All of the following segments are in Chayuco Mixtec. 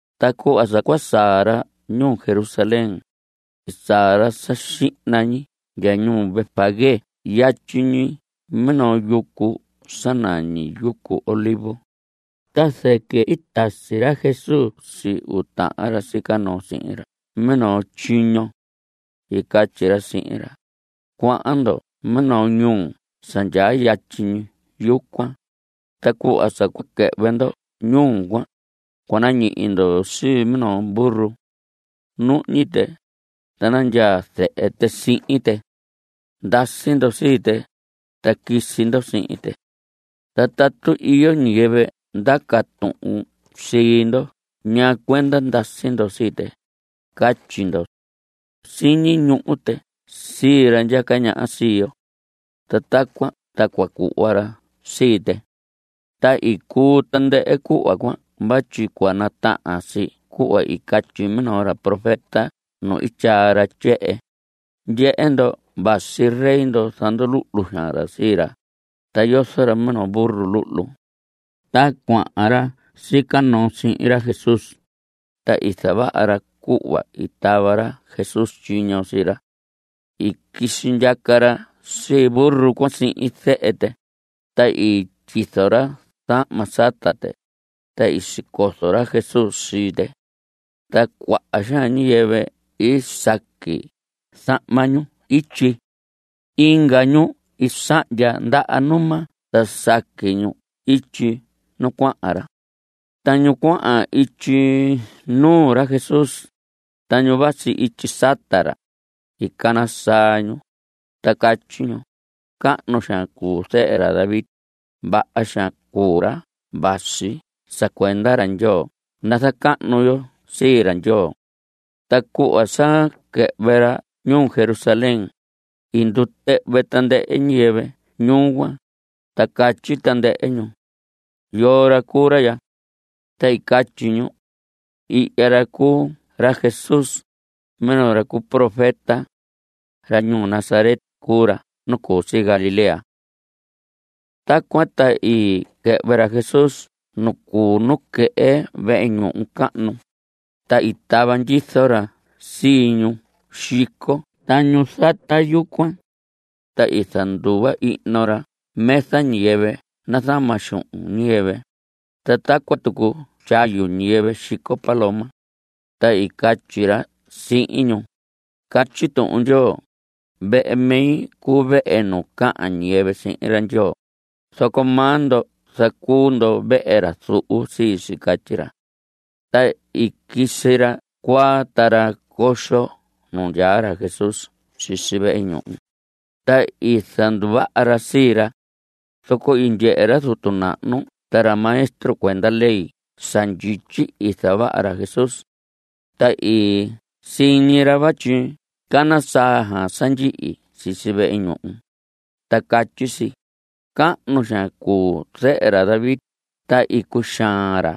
Ta cuhva sa cua saa ra ñuu Jerusalén, i saa ra sa xihna ñi ndya ñuu Betfagé yatyi ñi minoo yucu sa nañi yucu Olivos, ta zɨquɨ i tasi ra Jesús sii uu tahan ra sica noo sihin ra minoo tyiño. I catyi ra sihin ra: Cuahan ndo minoo ñuu sa ndyaa yatyi ñi yucuan, ta cuhva sa quɨhvɨ ndo ñuu cuan, cua nañihi ndo sii minoo burro. Nuhñi tɨ, ta nandyaa zehe tɨ sihin tɨ. Ndasi ndo sii tɨ, ta quisi ndo sihin tɨ. Ta tatu iyo ñiyɨvɨ ndaca tuhun sii ndo ñaa cuenda ndasi ndo sii tɨ, catyi ndo: “Siñi ñuhu tɨ sii ra ndyaca ñaha sii yo.” Ta tacuan ta cua cuhva ra sii tɨ. Ta i cuu tandɨhɨ cuhva cuan vatyi cua natahan si cuhva i catyi minoo ra profeta nu i tyaa ra tyehen: Ndyehe ndo, vasi rey ndo. Zanduluhlu xaan ra sii ra, ta yozo ra minoo burro luhlu. Ta cuahan ra sica noo sihin ra Jesús, ta i zavaha ra cuhva i tava ra Jesús tyiño sii ra. I quisi ndyaca ra sii burro cuan sihin zehe tɨ, ta i tyizo ra zahma sata tɨ, ta i sicozo ra Jesús sii tɨ. Ta cuaha xaan ñiyɨvɨ i saqui zahma ñu ityi. Inga ñu i sahndya ndaha numa ta saqui ñu ityi nu cuahan ra. Ta ñu cuahan ityi nuu ra Jesús, ta ñu vasi ityi sata ra, i cana saa ñu, ta catyi ñu: ¡Cahnu xaan cuu zehe ra David! ¡Vaha xaan cuu ra vasi sa cuenda ra Ndyoo! ¡Nazacahnu yo sii ra Ndyoo! Ta cuhva sa quɨhvɨ ra ñuu Jerusalén, i ndutɨhvɨ tandɨhɨ ñiyɨvɨ ñuu cuan, ta catyi tandɨhɨ ñu: ¿Yoo ra cuu ra ya? Ta i catyi ñu: Ihya ra cuu ra Jesús, minoo ra cu profeta. Ra ñuu Nazaret cuu ra nu cu si Galilea. Tacuan ta i quɨhvɨ ra Jesús nu cuu nuquehe vehe ñuhu cahnu, ta i tava ndyizo ra sii ñu xico ta ñu zata yucuan. Ta i zanduva ihno ra mesa ñiyɨvɨ nazama xuhun ñiyɨvɨ, ta tacuan tucu tyayu ñiyɨvɨ xico paloma. Ta i catyi ra sihin ñu: Catyi Tuhun Ndyoo: “Vehe mi cuu vehe nu cahan ñiyɨvɨ sihin ra Ndyoo”; zoco maa ndo zacuu ndo vehe ra zuhu sii si. Catyi ra. Ta i quisi ra cuaa ta ra coxo nu ndyaa ra Jesús sisi vehe ñuhu, ta i zanduvaha ra sii ra. Zoco i ndyehe ra zutu nahnu ta ra maestro cuenda ley sa ndyityi i zavaha ra Jesús. Ta i siñi ra vatyi cana saa sa ndyihi sisi vehe ñuhu, ta catyi si: “Cahnu xaan cuu Zehe ra David.” Ta i cuxaan xaan ra.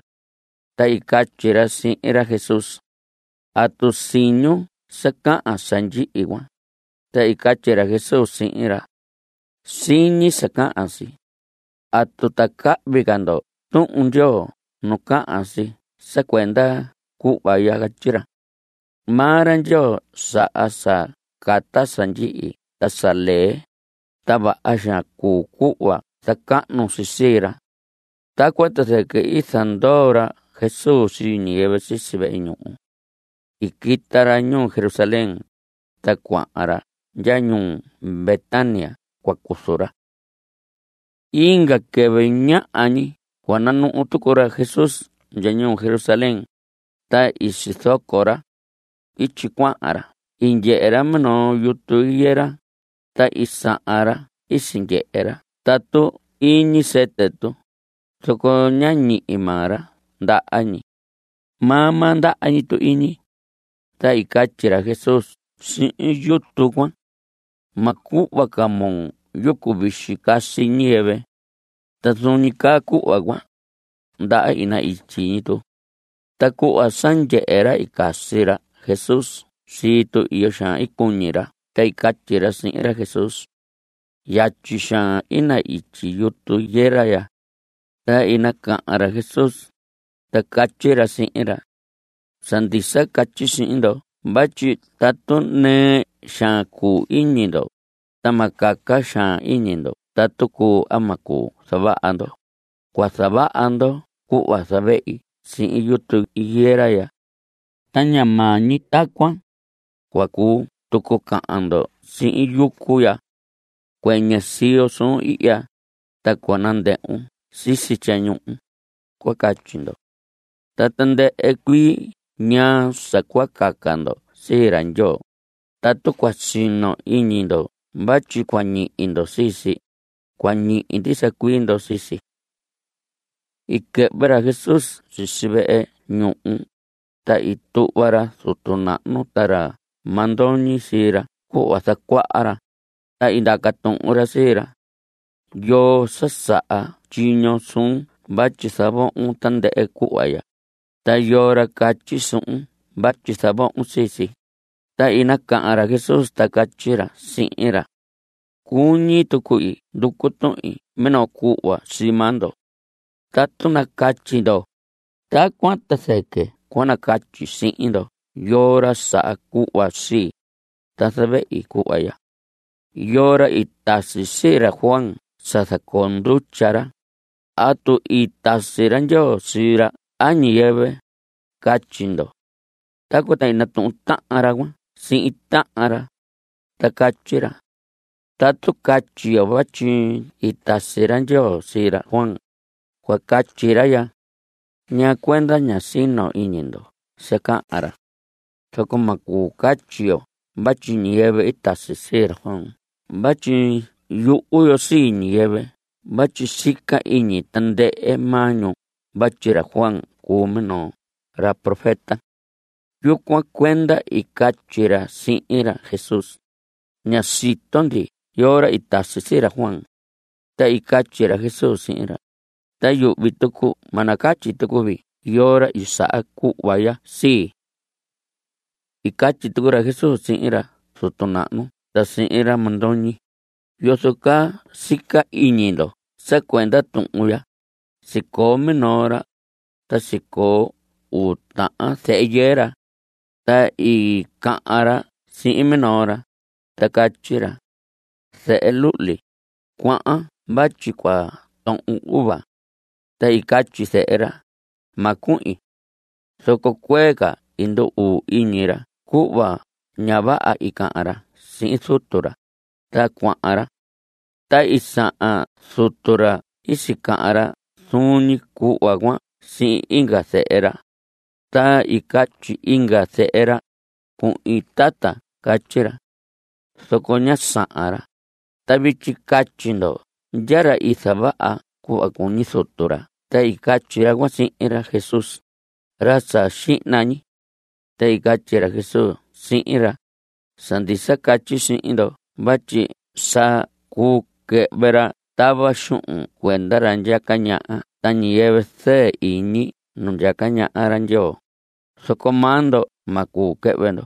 Ta i catyi ra sihin ra Jesús: ¿Atu siñun sa cahan sa ndyihi cuan? Ta i catyi ra Jesús sihin ra: Siñi sa cahan si. ¿Atu ta cahvi ca ndo Tuhun Ndyoo nu cahan si sa cuenda cuhva ya? Catyi si: Maa ra Ndyoo saha sa cata sa ndyihi ta sa lee, ta vaha xaan cuu cuhva zacahnu si sii ra. Tacuan ta zɨquɨ i zandoo ra Jesús sii ñiyɨvɨ sisi vehe ñuhu. I quita ra ñuu Jerusalén, ta cuahan ra ndya ñuu Betania cua cuzu ra. Inga quɨvɨ ñaha ñi cua nanuhu tucu ra Jesús ndya ñuu Jerusalén, ta i sizoco ra. Ityi cuahan ra i ndyehe ra minoo yutu higuera, ta i sahan ra i sindyehe ra tatu iñi sɨtɨ tu, zoco ñá ñihi maa ra ndaha ñi. Maa maa ndaha ñi tu iñi. Ta i catyi ra Jesús sihin yutu cuan: Ma cuhva ca moo yucu vixi casi ñiyɨvɨ. Ta zuun ñi caa cuhva cuan, ndaha i na‑ityi ñi tu. Ta cuhva sa ndyehe ra i casi ra Jesús sii tu, iyo xaan i cuñi ra ta i catyi ra sihin ra Jesús: ¡Yatyi xaan i na‑ityi yutu higuera ya! Ta i nacahan ra Jesús, ta catyi ra sihin ra: Sa ndisa catyi sihin ndo vatyi tatu nɨɨ xaan cuu iñi ndo, ta ma caca xaan iñi ndo tatu cuu a ma cuu zavaha ndo, cua zavaha ndo cuhva i zavehi sihin yutu higuera ya. Ta ña maa ñi tacuan. Cua cuu tucu cahan ndo sihin yucu ya: “Cuɨñɨ siyon ihya, ta cua ndɨhvun sisi tyañuhun”, cua catyi ndo. Ta tandɨhɨ cuii ñaa sa cua caca ndo sii ra Ndyoo, tatu cua sino iñi ndo vatyi cua ñihi ndo sii si, cua ñihi ndisa cuii ndo sii si. I quɨhvɨ ra Jesús sisi vehe ñuhu, ta i tuhva ra zutu nahnu ta ra mandoñi sii ra cuhva zacuaha ra, ta i ndaca tuhun ra sii ra: ¿Yoo sa saha tyiño suun vatyi zavohon tandɨhɨ cuhva ya? ¿Ta yoo ra catyi suhun vatyi zavohon sii si? Ta i nacahan ra Jesús, ta catyi ra sihin ra: Cuñi tuqui nducu tuhin minoo cuhva sii maa ndo. Tatu nacatyi ndo, tacuan ta zɨquɨ cua nacatyi sihin ndo yoo ra saha cuhva sii, ta zavehi cuhva ya. ¿Yoo ra i tasi sii ra Juan sa zacoo ndutya ra? ¿Atu i tasi ra Ndyoo sii ra a ñiyɨvɨ? Catyi ndo. Tacuan ta i natuhun tahan ra cuan sihin tahan ra, ta catyi ra: Tatu catyi yo vatyi i tasi ra Ndyoo sii ra Juan, cua catyi ra ya: “¿Ñaa cuenda ñá sino iñi ndo sa cahan ra?” Zoco ma cuu catyi yo vatyi ñiyɨvɨ i tasi sii ra Juan vatyi yuhu yo sii ñiyɨvɨ vatyi sica iñi tandɨhɨ maa ñu vatyi ra Juan cuu minoo ra profeta. Yucuan cuenda i catyi ra sihin ra Jesús: Ña sito ndi yoo ra i tasi sii ra Juan. Ta i catyi ra Jesús sihin ra: Ta yuhvi tucu ma nacatyi tucu vii yoo ra i saha cuhva ya sii. I catyi tucu ra Jesús sihin ra zutu nahnu ta sihin ra mandoñi: ¿Yozo caa sica iñi ndo sa cuenda tuhun ya? Sicoo minoo ra, ta sicoo uu tahan zehe yɨɨ ra. Ta i cahan ra sihin minoo ra, ta catyi ra: “Zehe luhli, cuahan vatyi cua tohon uva.” Ta i catyi zehe ra: “Ma cuhin.” Zoco cuee ca i ndu‑uu iñi ra cuhva ña vaha i cahan ra sihin zutu ra, ta cuahan ra. Ta i sahan zutu ra i sicahan ra zuun ñi cuhva cuan sihin inga zehe ra. Ta i catyi inga zehe ra: “Cuhin, tata.” Catyi ra. Zoco ñá sahan ra. Ta vityi catyi ndo ¿ndya ra i zavaha cuhva cuñi zutu ra? Ta i catyi ra cuan sihin ra Jesús: Ra sa xihna ñi. Ta i catyi ra Jesús sihin ra: Sa ndisa catyi sihin ndo vatyi sa cuu quɨhvɨ ra tava xuhun cuenda ra ndyaca ñaha ta ñiyɨvɨ zɨɨ iñi nu ndyaca ñaha ra Ndyoo, zoco maa ndo ma cuu quɨhvɨ ndo.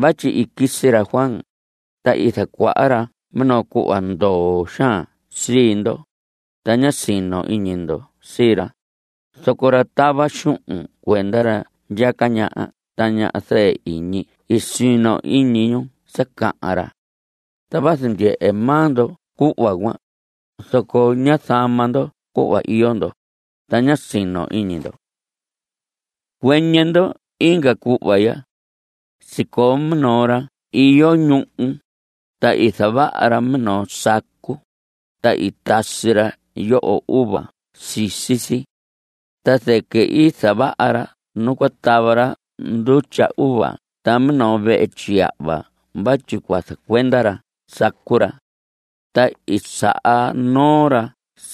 Vatyi i quisi ra Juan, ta i zacuaha ra minoo cuhva ndoo xaan sii ndo, ta ñá sino iñi ndo sii ra, zoco ra tava xuhun cuenda ra ndyaca ñaha ta ñu zɨɨ iñi i sino iñi ñu sa cahan ra. Ta vazu ndyehe maa ndo cuhva cuan, zoco ñá zama ndo cuhva iyo ndo, ta ña sino iñi ndo. Cuɨñɨ ndo inga cuhva ya. Sicoo minoo ra iyo ñuhu, ta i zavaha ra minoo sacu, ta i tasi ra yoho uva sisi si. Ta zɨquɨ i zavaha ra nu cua tava ra ndutya uva ta minoo vehe tyiyahva vatyi cua zacuenda ra sacu ra. Ta i saha noo ra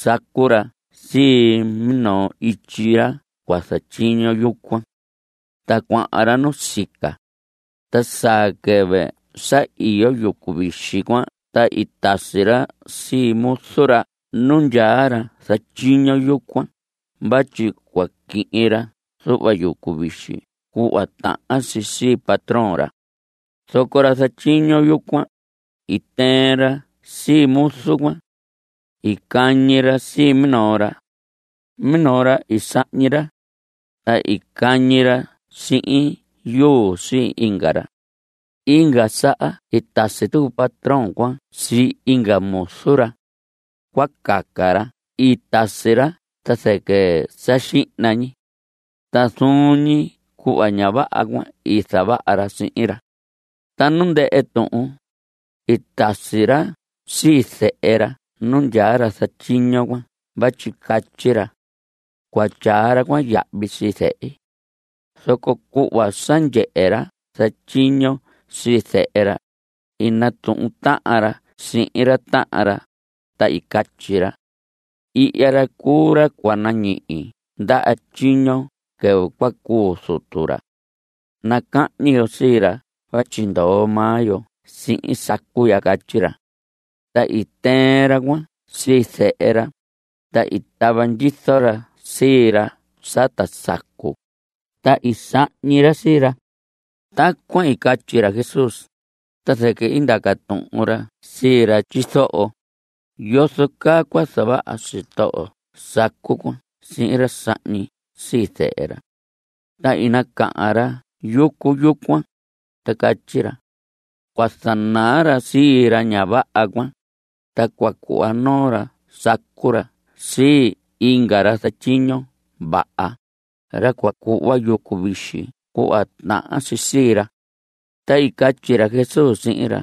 sacu ra sii minoo ityi ra cua zatyiño yucuan. Ta cuahan ra nusica. Ta saa quɨvɨ sa iyo yucu vixi cuan ta i tasi ra sii muzu ra nu ndyaa ra zatyiño yucuan vatyi cua quihin ra zuhva yucu vixi cuhva tahan si sii patrón ra. Zoco ra zatyiño yucuan, i tɨɨn ra sii muzu cuan. I cañi ra sii minoo ra. Minoo ra i sahñi ra. Ta i cañi ra sihin yuu sii inga ra. Inga saha i tasi tucu patrón cuan sii inga muzu ra. Cuaha ca ra i tasi ra ta zɨquɨ sa xihna ñi. Ta zuun ñi cuhva ña vaha cuan i zavaha ra sihin ra. Ta nu ndɨhɨ tuhun, i tasi ra sii zehe ra nu ndyaa ra zatyiño cuan vatyi catyi ra: “Cua tyaa ra cuan yahvi sii zehi.” Zoco cuhva sa ndyehe ra zatyiño sii zehe ra, i natuhun tahan ra sihin tahan ra, ta i catyi ra: “Ihya ra cuu ra cua nañihi ndaha tyiño quɨvɨ cua cuu zutu ra. Nacahñi yo sii ra vatyi ndoo maa yo sihin sacu ya.” Catyi ra. Ta i tɨɨn ra cuan sii zehe ra, ta i tava ndyizo ra sii ra sata sacu, ta i sahñi ra sii ra. Tacuan i catyi ra Jesús, ta zɨquɨ i ndaca tuhun ra sii ra tyizoho: ¿Yozo caa cua zavaha sitoho sacu cuan sihin ra sahñi sii zehe ra? Ta i nacahan ra yucu yucuan, ta catyi ra: Cua zanaa ra sii ra ña vaha cuan, ta cua cuhva noo ra sacu ra sii inga ra zatyiño vaha, ra cua cuhva yucu vixi cuhva tahan si sii ra. Ta i catyi ra Jesús sihin ra: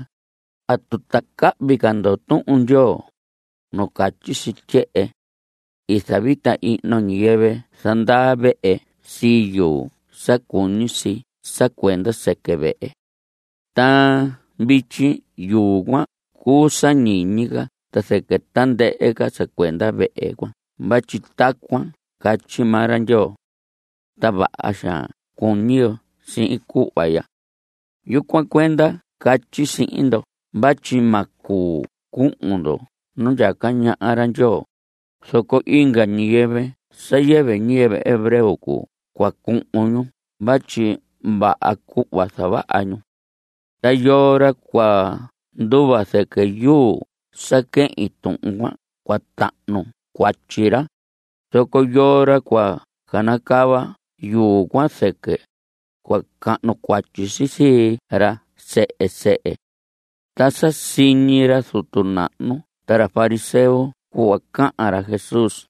¿Atu ta cahvi ca ndo Tuhun Ndyoo? nu catyi si tyehen: “I zavita ihno ñiyɨvɨ zandaa vehe sii yuu sa cuñi si sa cuenda sɨquɨ vehe. Ta vityi yuu cuan cuu sa ñiñi ca ta zɨquɨ tandɨhɨ sa cuenda vehe cuan vatyi tacuan catyi maa ra Ndyoo. Ta vaha xaan cuñi yo sihin cuhva ya.” Yucuan cuenda catyi sihin ndo vatyi ma cuu cuhun ndo nu ndyaca ñaha ra Ndyoo, zoco inga ñiyɨvɨ sa yɨvɨ ñiyɨvɨ hebreo cuu cua cuhun ñu vatyi vaha cuhva zavaha ñu. Ta yoo ra cua nduva zɨquɨ yuu sa quehin tuhun cuan, cua tahnu cuatyi ra, zoco yoo ra cua canacava yuu cuan zɨquɨ, cua cahnu cuatyi si sii ra sehe sehe. Ta sa siñi ra zutu nahnu ta ra fariseo cuhva cahan ra Jesús,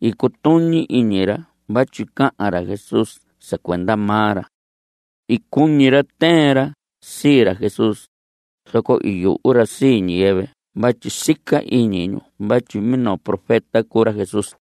i cutuñi iñi ra vatyi cahan ra Jesús sa cuenda maa ra. I cuñi ra tɨɨn ra sii ra Jesús, zoco i yuhu ra sii ñiyɨvɨ vatyi sica iñi ñu vatyi minoo profeta cuu ra Jesús.